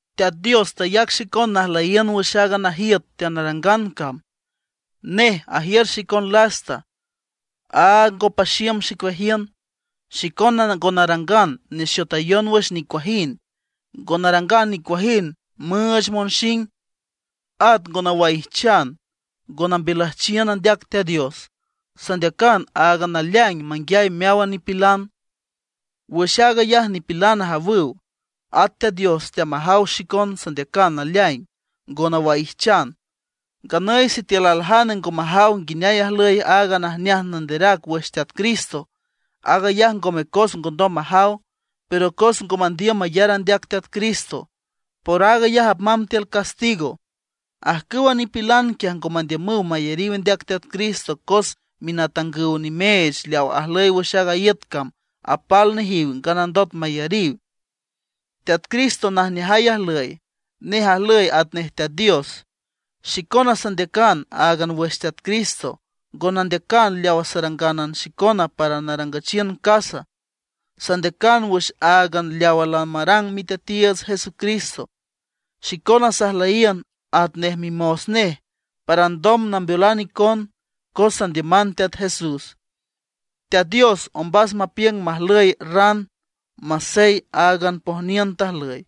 Teat Dios tayac xicon najlüyiün wüx aaga najiüt teanarangan cam. Nej ajiür xicon lasta, áag ngo paxiüm xicueajiün. Xicona ngo narangan nexotayon wüx nicuajind; ngo narangan nicuajind müüch monxing. At ngo nawaijchan, ngo nambiülüjchiün andeac Teat Dios. Sandeacan áagan naleaing manguiay meáwan nipilan. Wüx aag ayaj nipilan ajawüw, at Teat Dios teamajaw xicon sandeacan naleaing, ngo nawaijchan. Nganüy sitiül aljane ngo majaw nguineay ajlüy aaga Najneaj Nanderac wüx Teat Cristo, aag ayaj ngome cos ngondom majaw, pero cos ngo mandiüm mayar andeac Teat Cristo; por aag ayaj apmamb tiül castigo. Ajcüwa nipilan quiaj ngo mandiümüw mayariw andeac Teat Cristo, cos minatangüw nimeech leaw ajlüy wüx a iüt cam apal nejiw nganandot mayariw. Teat Cristo najneajay ajlüy; nej ajlüy atanej Teat Dios. Xicona sandeacan áagan wüx Teat Cristo; ngo nandeacan leawa sarangan xicona para narangüchiün casa. Sandeacan wüx áagan leawa lamarang Miteatiiüts Jesucristo. Xicona sajlüyiün atnej mimos nej para alndom nambeolan icon, cos sandiüman Teat Jesús. Teat Dios ombas mapiüng majlüy ran masey áagan pojniün tajlüy.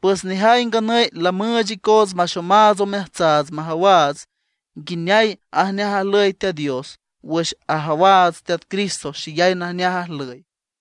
Pues nejay nganüy lamüüch icoots maxomaats omeajtsaats majawaats nguineay ajneaj ajlüy Teat Dios wüx ajawaats Teat Cristo xeyay najneaj ajlüy.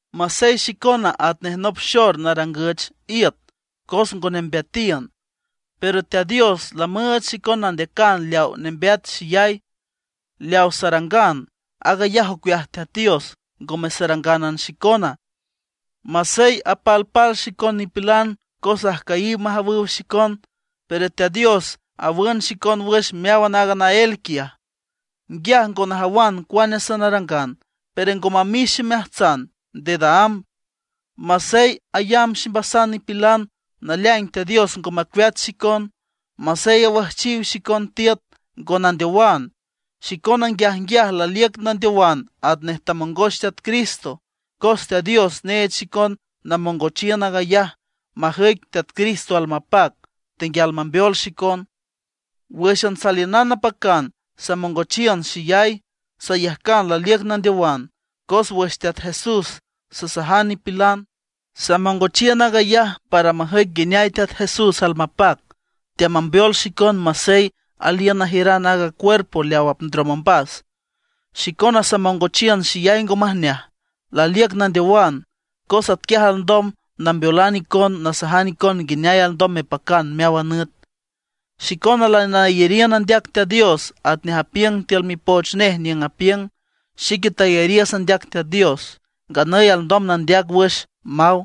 Masey xicona atnej nop xor narangüch iüt cos ngo nembeatiün, pero Teat Dios lamüüch xicon nandeacan leaw nembeat xeyay. Leaw sarangan, aag ayaj ocueaj Teat Dios, ngome sarangánan xicona. Masey apalpal xicon nipilan cos ajcüyiw majawüw xicon, pero Teat Dios awün xicon wüx meáwan aaga naél quiaj. Nguiaj ngo najawan cuane sanarangan, pero ngo mamix ximeajtsan dedaámb. Masey ayamb ximbasan nipilan, naleaing Teat Dios ngo macueat xicon. Masey awüjchiw xicon tiüt, ngo nandeowan. Xicona nguiajnguiaj laliüc nandeowan atnej tamongoch Teat Cristo; cos Teat Dios neech xicon namongochiün aag ayaj majüic Teat Cristo almapac, tenguial mambeol xicon. Wǘxan saliünan napacan samongochiün xeyay, sayajcan laliüc nandeowan, cos wüx Teat Jesús sasajan nipilan. Samongochiün aag ayaj para majüic nguineay Teat Jesús almapac, teamambeol xicon masey aliün najiüran aaga cuerpo leaw apndrom ombas. Xicona samongochiün xeyay ngo majneaj, laliüc nandeowan; cos atquiaj alndom nambeolan icon nasajan icon nguineay alndom mepacan meáwan nüt. Xicona lanayariün andeac Teat Dios atnej apiüng tiül Mipoch Nej niüng apiüng: “Xique tayariüs andeac Teat Dios, nganüy alndom nandeac wüx”, maw.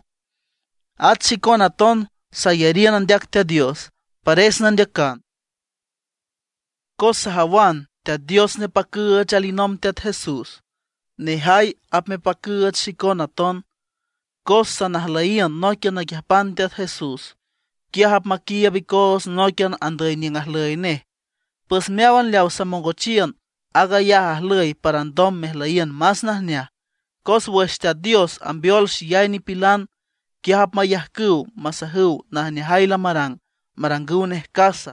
At xicona aton sayariün andeac Teat Dios, pares nandeacan. Cos sajawan Teat Dios nepacüüch alinomb Teat Jesús, nejay apmepacüüch xicon aton, cos sanajlüyiün nóiquian naquiüjpan Teat Jesús. Quiaj apmaquiiüb icoots nóiquian andüy niüng ajlüy nej. Pues meáwan leaw samongochiün, aag ayaj ajlüy para alndom mejlüyiün más najneaj, cos wüx Teat Dios ambeol xeyay nipilan, quiaj apmayajcüw masajüw najneajay lamarang, marangüw nej casa.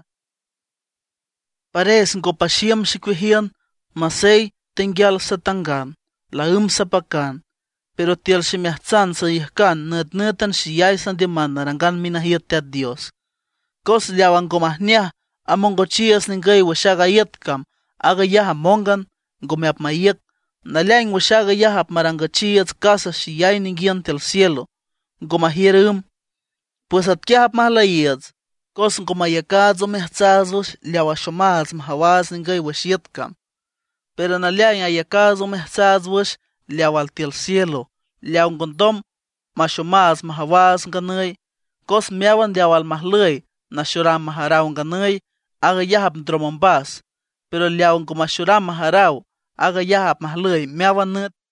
¡Pares ngo paxiüm xicueajiün! Masey tenguial satangan, laǘmb sapacan; pero tiül ximeajtsan sayajcan nütnǘtan xeyay sandiüman narangan minajiüt Teat Dios. Cos leawa ngo majneaj amongochiiüts ningüy wüx aaga iüt cam, aag ayaj amóngan, ngome apmaíüc. Naleaing wüx aag ayaj apmarangüchiiüts casa xeyay ninguiün tiül cielo, ngo majiür ümb. Pues atquiaj apmajlüyiiüts, cos ngo mayacaats omeajtsaats wüx leaw axomaats majawaats ningüy wüx iüt cam; pero naleaing ayacaats omeajtsaats wüx leaw altiül cielo, leaw ngondom maxomaats majawaats nganüy. Cos meáwan leaw almajlüy naxoram majaraw nganüy, aag ayaj apndrom ombas; pero leaw ngo maxoram majaraw, aag ayaj apmajlüy meáwan nüt.